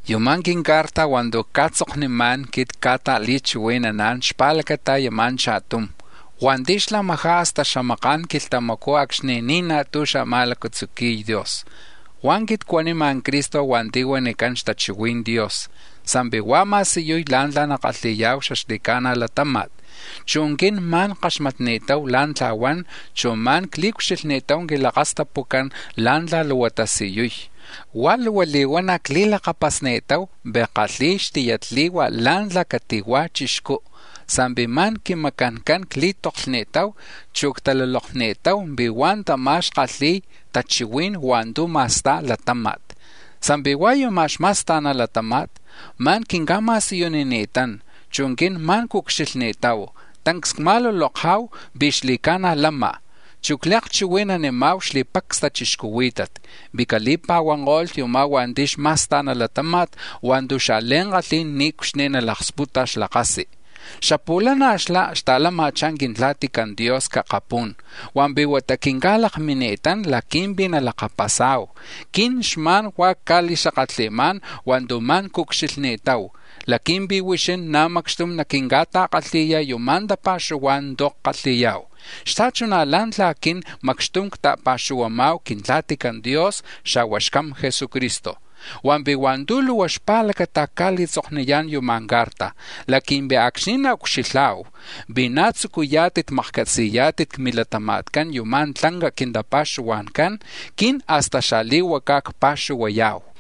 Unú̱ c-quincarta̱ hua̱ntu̱ cca̱tzoknimá̱n quit cca̱li̱ta̱chihui̱naná̱n xpa̱lacata yuma̱ cha̱tum hua̱nti̱ xlamajá̱ hasta xamaka̱n quilhtamacú̱ acxni̱ ni̱ naj tú̱ xa̱ma̱lacatzuqui̱y Dios. Hua̱ quit cuanima̱ Cristo hua̱nti̱ huanicán Xtachihui̱n Dios sa̱mpi̱ huá̱ ma̱siyuy la̱ntla̱ nakalhi̱ya̱hu xaxli̱ca̱na̱ latáma̱t, chu̱ quin ma̱n ckaxmatni̱tahu la̱ntla̱ huan, chu̱ ma̱n cli̱ucxilhni̱tahu quilakastapucán la̱ntla̱ luhua tasiyuy, huá̱ luhua li̱huana̱ cli̱lakapasni̱tahu pi̱ kalhi̱y xtiyatli̱hua̱ la̱ntla̱ cati̱hua̱ chixcú̱ sa̱mpi̱ ma̱n quimacancán cli̱toklhni̱tahu, chu̱ ctalulokni̱tahu pi̱ hua̱ tamá̱ xkalhi̱y tachihuí̱n hua̱ntu̱ ma̱sta̱y latáma̱t. Sa̱mpi̱ hua̱ yuma̱ xma̱sta̱na latáma̱t, ma̱n quinca̱tasiyunini̱tán, chu̱ quin ma̱n cucxilhni̱tahu, tancs cma̱luloka̱hu pi̱ xli̱ca̱na̱ lama̱, chu̱ cli̱akchihui̱nanima̱hu xli̱pacs tachixcuhuí̱tat pi̱ cali̱pa̱huanko̱lh yumá̱ hua̱nti̱ xma̱sta̱na latáma̱t hua̱ntu̱ xa̱li̱ankalhí̱n niucxni̱ nalaksputa̱ xlakasi. Xapu̱lana̱ xlá̱ xta̱lama̱chá̱ Quintla̱tican Dios c-akapú̱n hua̱mpi̱ huata ma̱n quinca̱lakmini̱tán laqui̱mpi̱ nalakapasa̱hu. Quin xma̱n huá̱ cca̱li̱xakatli̱má̱n hua̱ntu̱ ma̱n cucxilhni̱tahu, laqui̱mpi̱ huixín na̱ macxtum naquinca̱ta̱kalhi̱yá̱n yuma̱ tapa̱xuhuá̱n tu̱ ckalhi̱ya̱hu, xta̱chuná̱ la̱ntla̱ quin macxtum cta̱pa̱xuhuama̱hu Quintla̱tican Dios, xa̱hua̱ Xcam Jesucristo. Hua̱mpi̱ hua̱ntu̱ luhua xpa̱lacata̱ cca̱li̱tzokniyá̱n yuma̱ ca̱rta̱ laqui̱mpi̱ acxni̱ nacucxilha̱hu pi̱ na̱ tzucuyá̱tit makcatzi̱yá̱tit c-milatama̱tcán yuma̱ tlanca quintapa̱xuhua̱ncán, quin hasta xali̱huacá̱ nacpa̱xuhuaya̱hu.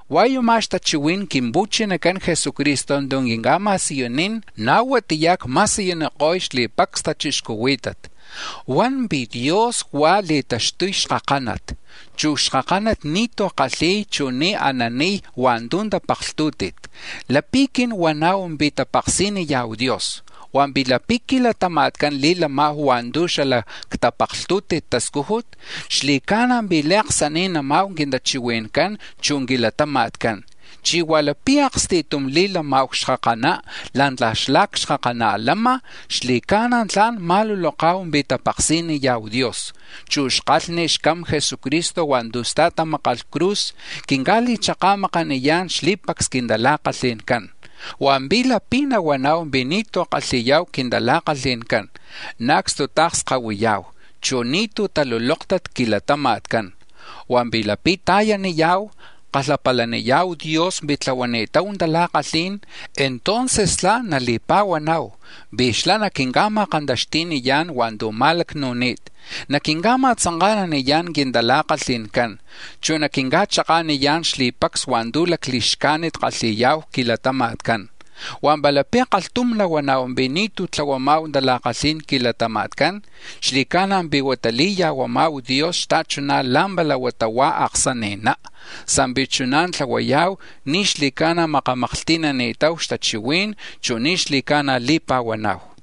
Hua̱ yuma̱ xtachihui̱n Quimpu̱chinacan Jesucristo tu̱ quinca̱ma̱siyunín, na̱ huatiyá̱ cma̱siyuniko̱y xli̱pacs tachixcuhuí̱tat, huan pi̱ Dios huá̱ li̱taxtuy xkakánat, chu̱ c-xlatáma̱t ni̱tú̱ kalhi̱y, chu̱ ni̱ ananiy hua̱ntu̱ tapaklhtú̱ti̱t. Lapi̱ quin huana̱hu pi̱ tapaksiniya̱hu Dios hua̱mpi̱ lapi̱ c-quilatama̱tcán li̱lama̱hu hua̱ntu̱ xala c-tapaklhtu̱ti̱t tascújut, xli̱ca̱na̱ pi̱ li̱aksani̱nana̱hu quintachihui̱ncán, chu̱ quilatama̱tcán. Chí̱ hua̱ lapi̱ aksti̱tum li̱lama̱hu ca̱xkakaná̱, la̱ntla̱ xlá̱ ca̱xkakaná lama̱, xli̱ca̱na̱ tla̱n ma̱luloka̱hu pi̱ tapaksiniya̱hu Dios, chu̱ xkalhni xCam Jesucristo hua̱ntu̱ stajmákalh c-cruz quinca̱li̱chaka̱makaniyá̱n xli̱pacs quintala̱kalhi̱ncán. Hua̱mpi̱ lapi̱ nahuana̱hu pi̱ ni̱tú̱ kalhi̱ya̱hu quintala̱kalhi̱ncán, na̱ acstuta̱kskahuiya̱hu, chu̱ ni̱tú̱ talulóktat c-quilatama̱tcán. Hua̱mpi̱ lapi̱ ta̱yaniya̱hu, kalhapalaniya̱hu Dios pi̱ tlahuani̱tahu tala̱kalhí̱n, entonces tla̱n nali̱pa̱huana̱hu pi̱ xlá̱ naquinca̱ma̱kantaxti̱niyá̱n hua̱ntu̱ ma̱lacnu̱ni̱t, naquinca̱ma̱tzanka̱naniyá̱n quintala̱kalhi̱ncán, chu̱ naquinca̱chaka̱niyá̱n xli̱pacs hua̱ntu̱ li̱xcájnit kalhi̱ya̱hu c-quilatama̱tcán. Hua̱ palapi̱ kalhtum huana̱hu pi̱ ni̱tú̱ tlahuama̱hu tala̱kalhí̱n c-quilatama̱tcán, xli̱ca̱na̱ pi̱ huata li̱ya̱huaya̱hu Dios xta̱chuná̱ la̱mpala huata huá̱ xaaksani̱ná; lapi̱ chuná̱ tlahuaya̱hu ni̱ xli̱ca̱na̱ makamaklhti̱nani̱tahu xtachihuí̱n, chu̱ ni̱ xli̱ca̱na̱ li̱pa̱huana̱hu.